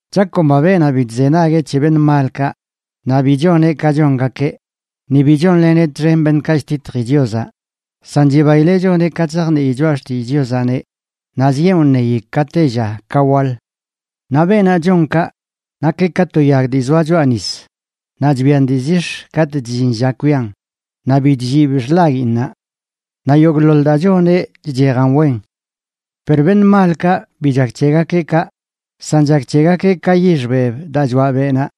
Chakomba beenaꞌ bi chzenagueꞌ c̱he beṉꞌ malkaꞌ, naꞌ bi choneꞌ ka chongakeꞌ, ni bi chonleneꞌ txen beṉꞌkaꞌ chtitji Chiozaꞌ, san chibaileꞌ choneꞌ ka, chzajnii choꞌa xtillꞌ Chiozaꞌneꞌ, naꞌ zieꞌn wṉeyi ka tella ka waḻ. Naꞌ beenaꞌ chon kaꞌ, nakeꞌ ka to yag dii zoa choꞌa nis, naꞌ chbian dii zix̱ katꞌ chllin lla kwian, naꞌ bi chllib xḻaguiinnaꞌ. Naꞌ yogꞌḻoḻ daa choneꞌ chchejan wen. Per beṉꞌ malkaꞌ bi chak c̱hegakeꞌ kaꞌ, san chak c̱hegakeꞌ ka yix beb daa choaꞌ beꞌnaꞌ.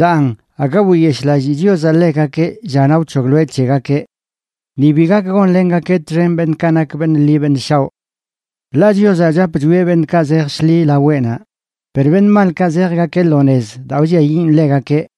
Daan aga wiyeshꞌlallii Chiozaꞌ ḻegakeꞌ llanaꞌ wc̱hogloeꞌ c̱hegakeꞌ. Ni bi gak gonlengakeꞌ txen beṉꞌkaꞌ nak beṉꞌ ḻi beṉꞌ shaoꞌ. Ḻaꞌ Chiozaꞌ chap chwieꞌ beṉꞌkaꞌ zej shḻi laweꞌnaꞌ, per beṉꞌ malkaꞌ zejgakeꞌ lo nez daa wlliayiꞌn ḻegakeꞌ.